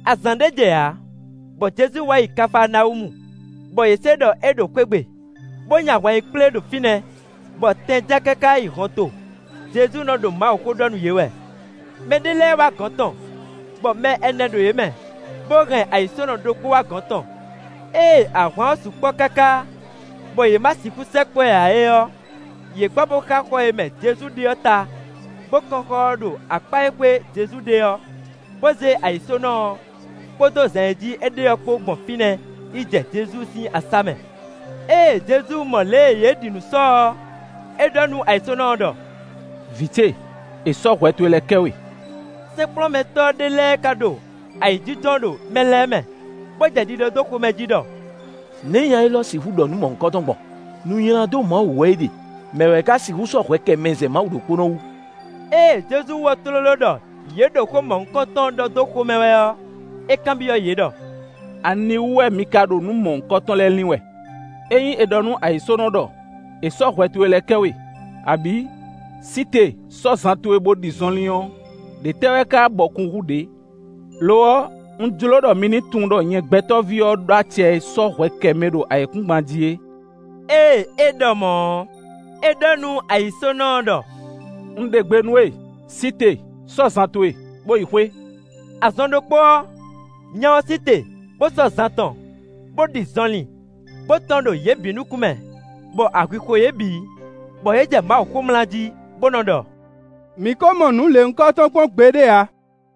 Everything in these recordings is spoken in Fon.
Azǎn ɖé jɛ ǎ, bɔ Jezu wá yi Kafaanawúmu, bɔ yě se ɖɔ é ɖo xwé gbe, bó nyi ahwan yi kplé ɖo fínɛ́, bɔ tɛn ján káká yi hɔnto. Jezu nɔ ɖo Mawuxó ɖɔ nú yě wɛ. Mɛ ɖé lɛ́ɛ wá gɔ̌n tɔn, bɔ mɛ ɛnɛ ɖo yě mɛ, bó hɛn ayǐsónɔ ɖokpó wá gɔ̌n tɔn. Ée ahwan ɔ́ sukpɔ́ káká, bɔ yě ma sixú sɛkpɔ́ ɛ ǎ é ɔ́, yě gbɔ bó xá xɔ e mɛ Jezu ɖe ɔ́ ta, bó kɔ́n xɔ ɔ́ ɖo akpá e xwé Jezu ɖe ɔ́, bó zé ayǐsónɔ ɔ́, kpódó zan e jí é ɖe ɔ́ kpó gbɔn fínɛ́ yi jɛ Jezu sín asá mɛ. Ée Jezu mɔ lě e yě ɖi nǔ sɔ ɔ́, é ɖɔ nú ayǐsónɔ ɔ́ ɖɔ: “Vǐ ce, è sɔ́ hwɛ towe lɛ́ɛ kɛ we.” Sɛ́nkplɔ́nmɛtɔ́ ɖé lɛ́ɛ ká ɖo ayǐjínjɔ́n ɖo mɛ lɛ́ɛ mɛ, bó jɛ ɖiɖɔ dó xomɛ jí ɖɔ: “Nɛ̌ nya élɔ́ sixú ɖɔ nǔ mɔ̌hunkɔtɔn gbɔn? Nu nylá dó Mawu wú wɛ é ɖe. Mɛ̌ wɛ ká sixú sɔ́ hwɛ kɛ mɛ zɛ Mawu ɖokpónɔ wú?” Ée Jezu wɔ́ tlóló ɖɔ yě ɖo xó mɔ̌hunkɔtɔn ɖɔ dó xomɛ wɛ ɔ́, é kanbyɔ́ yě ɖɔ: “Aniwú wɛ mi ka ɖo nǔ mɔ̌hunkɔtɔn lɛ́ɛ lin wɛ? Ényí è ɖɔ nú ayǐsónɔ ɖɔ: ‘È sɔ́ hwɛ towe lɛ́ɛ kɛ we,’ abǐ, ‘Sí te, sɔ́ zan towe bo ɖi zɔnlin’ ɔ́, ɖě tɛ́ wɛ ká bɔkun hú ɖě? Lo ɔ́, un jló ɖɔ mi ní tunwun ɖɔ nyɛ Gbɛtɔ́ví ɔ́ ɖó acɛ e sɔ́ hwɛ kɛ mɛ ɖo ayǐkúngban jí é”. Ée é ɖɔ mɔ̌ ɔ́, é ɖɔ nú ayǐsónɔ ɔ́ ɖɔ: “Un ɖe gbe nú we, sí te, sɔ́ zan towe, bó yi xwé.” Azɔn ɖokpó ɔ́, nya ɔ́ sí te, bó sɔ́ zan tɔn, bó ɖi zɔnlin, bó tɔ́n ɖo yě bǐ nukún mɛ, bɔ ahwi xo yě bǐ; bɔ yě jɛ Mawu xomlá jí, bó nɔ́ ɖɔ: “Mǐ kó mɔ nǔ lěhunkɔtɔn kpɔ́n gbeɖé ǎ.”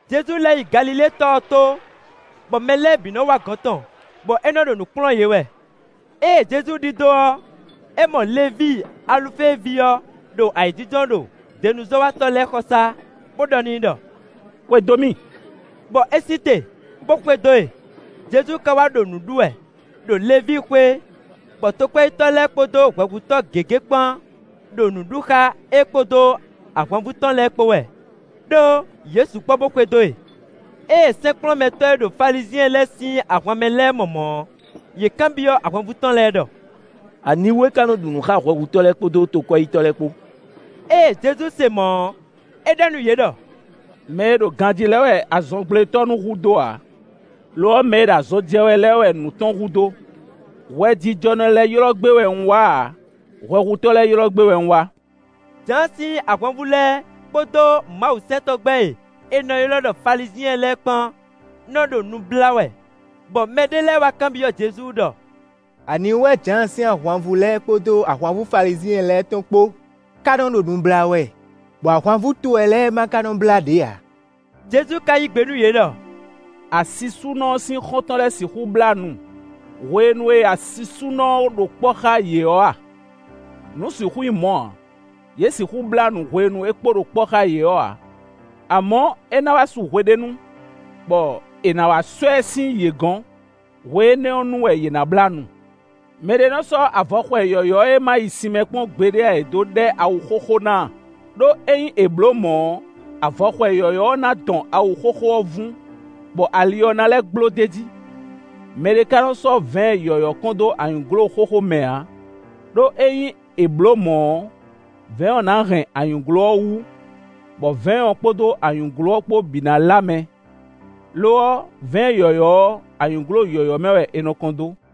Jezu lɛ́ yi Galilée tɔ ɔ́ tó, bɔ mɛ lɛ́ɛ bǐ nɔ́ wá gɔ̌n tɔn, bɔ é nɔ ɖo nǔ kplɔ́n yě wɛ. Ée Jezu ɖidó ɔ́, é mɔ Levíi Alufée ví ɔ́ ɖo ayǐjínjɔ́n ɖo denuzɔ́watɔ́ lɛ́ɛ xɔsá, bó ɖɔ n'i ɖɔ: “Xwedó mì.” Bɔ é sí te, bó xwedó e. Jezu ka wá ɖo nǔ ɖu wɛ ɖo Levíi xwé, bɔ tokwɛ́yítɔ́ lɛ́ɛ kpódó hwɛhutɔ́ gěgé kpán ɖo nǔ ɖu xá é kpódó ahwanvú tɔn lɛ́ɛ kpó wɛ, ɖó yě sukpɔ́ bó xwedó e. Ée sɛ́nkplɔ́nmɛtɔ́ e ɖo Falizyɛn lɛ́ɛ sín ahwan mɛ lɛ́ɛ mɔ mɔ̌ ɔ́, yě kanbyɔ́ ahwanvú tɔn lɛ́ɛ ɖɔ: “Aniwú é ká nɔ́ ɖu nǔ xá hwɛhutɔ́ lɛ́ɛ kpódó tokwɛ́yítɔ́ lɛ́ɛ kpó?” Ée Jezu se mɔ̌ ɔ́, é ɖɔ nú yě ɖɔ: “Mɛ e ɖo ganjí lɛ́ɛ wɛ azɔngblétɔ́ nú hudó ǎ; lo ɔ́, mɛ e ɖo azɔn jɛ wɛ lɛ́ɛ wɛ nǔ tɔn hudó. Hwɛjijɔnɔ lɛ́ɛ ylɔ́ gbé wɛ un wá ǎ; hwɛhutɔ́ lɛ́ɛ ylɔ́ gbé wɛ un wá.” Jǎan sín ahwanvú lɛ́ɛ kpódó mawusɛntɔ́gbɛ́ e è nɔ ylɔ́ ɖɔ Falizyɛn lɛ́ɛ kpán nɔ́ ɖo nu blá wɛ, bɔ mɛɖé lɛ́ɛ wá kanbyɔ́ Jezu ɖɔ: “Aniwú wɛ Jǎan sín ahwanvú lɛ́ɛ kpódó ahwanvú Falizyɛn lɛ́ɛ tɔn kpó ká nɔ́ ɖo nu blá wɛ, bɔ ahwanvú towe lɛ́ɛ ma ka nɔ́ blá ɖě ǎ?” Jezu ka yí gbe nú yě ɖɔ: “Asisúnɔ ɔ́ sín xɔ́ntɔn lɛ́ɛ sixú blá nu hwenu e asisúnɔ ɔ́ kpo ɖo kpɔ́ xá yě ɔ́ a? Nǔ sixú nyí mɔ̌ ǎ; yě sixú blá nu hwenu e é kpo ɖo kpɔ́ xá yě ɔ́ ǎ. Amɔ̌, é ná wá su hweɖénu, bɔ è nǎ wá sɔ́ ɛ sín yě gɔ́n; hwe énɛ́ ɔ́ nu wɛ yě ná blá nu. “Mɛ ɖé nɔ́ sɔ́ avɔxwɛ yɔ̌yɔ́ e ma yi sin mɛ kpɔ́n ǎ é dó ɖɛ́ awu xóxó ná ǎ, ɖó ényí è blǒ mɔ̌ ɔ́, avɔxwɛ yɔ̌yɔ́ ɔ́ ná dɔn awu xóxó ɔ́ vún, bɔ ali ɔ́ ná lɛ́ gbló d'é jí. Mɛ ɖé ka nɔ́ sɔ́ vɛ̌ɛn yɔ̌yɔ́ kɔn dó anyǔglo xóxó mɛ ǎ, ɖó ényí è blǒ mɔ̌ ɔ́, vɛ̌ɛn ɔ́ ná hɛn anyǔglo ɔ́ wú, bɔ vɛ̌ɛn ɔ́ kpódó anyǔglo ɔ́ kpó bǐ ná lá mɛ; lo ɔ́, vɛ̌ɛn yɔ̌yɔ́ ɔ́, anyǔglo yɔ̌yɔ́ mɛ wɛ è nɔ kɔn dó.”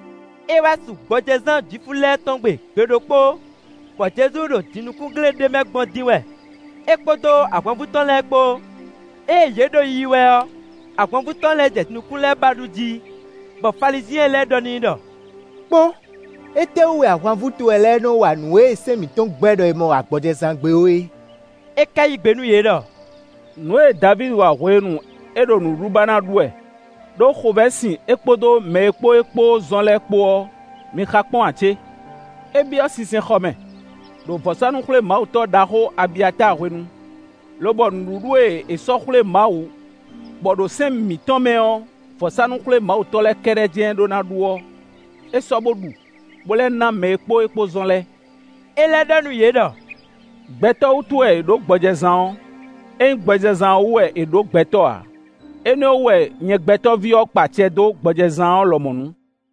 É wá su gbɔjɛzán Jwifu lɛ́ɛ tɔn gbe gbe ɖokpó, bɔ Jezu ɖo jinukúngle ɖé mɛ gbɔn dín wɛ, é kpódó ahwanvú tɔn lɛ́ɛ kpó. Ée yě ɖo yiyi wɛ ɔ́, ahwanvú tɔn lɛ́ɛ jɛ nǔkún lɛ́ɛ ba ɖu jí. Bɔ Falizyɛn lɛ́ɛ ɖɔ n'i ɖɔ: “Kpɔ́n! Étɛ́wú wɛ ahwanvú towe lɛ́ɛ nɔ́ wa nǔ e sɛ́n mǐtɔn gbɛ́ ɖɔ è ma wa gbɔjɛzán gbe ó é?” É ka yí gbe nú yě ɖɔ: “Nǔ e Davídi wa hwenu e é ɖo nǔɖuɖu ba ná ɖu wɛ, ɖó xovɛ́ sin é kpódó mɛ e kpó é kpó zɔn lɛ́ɛ kpó ɔ́, mi xa kpɔ́n ǎ cé? É byɔ́ sinsɛnxɔ mɛ, ɖo vɔ̌sánú-xwlémawutɔ́ ɖaxó Abiyatáa hwenu, lobɔ nǔɖuɖu e è sɔ́ xwlé Mawu bɔ ɖo sɛ́n mǐtɔn mɛ ɔ́, vɔ̌sánú-xwlémawutɔ́ lɛ́ɛ kɛ́ɖɛ́ jɛ́n ɖó ná ɖu ɔ́, é sɔ́ bo ɖu, bó lɛ́ ná mɛ e kpó é kpó zɔ́n lɛ́ɛ.” É lɛ́ ɖɔ nú yě ɖɔ: “Gbɛtɔ́ wútu wɛ è ɖǒ gbɔjɛzán ɔ́; é nyí gbɔjɛzán ɔ́ wú wɛ è ɖǒ gbɛtɔ́ ǎ. Énɛ́ ɔ́ wú wɛ nyɛ Gbɛtɔ́ví ɔ́ kpa acɛ dó gbɔjɛzán ɔ́ lɔmɔ̌ nu.”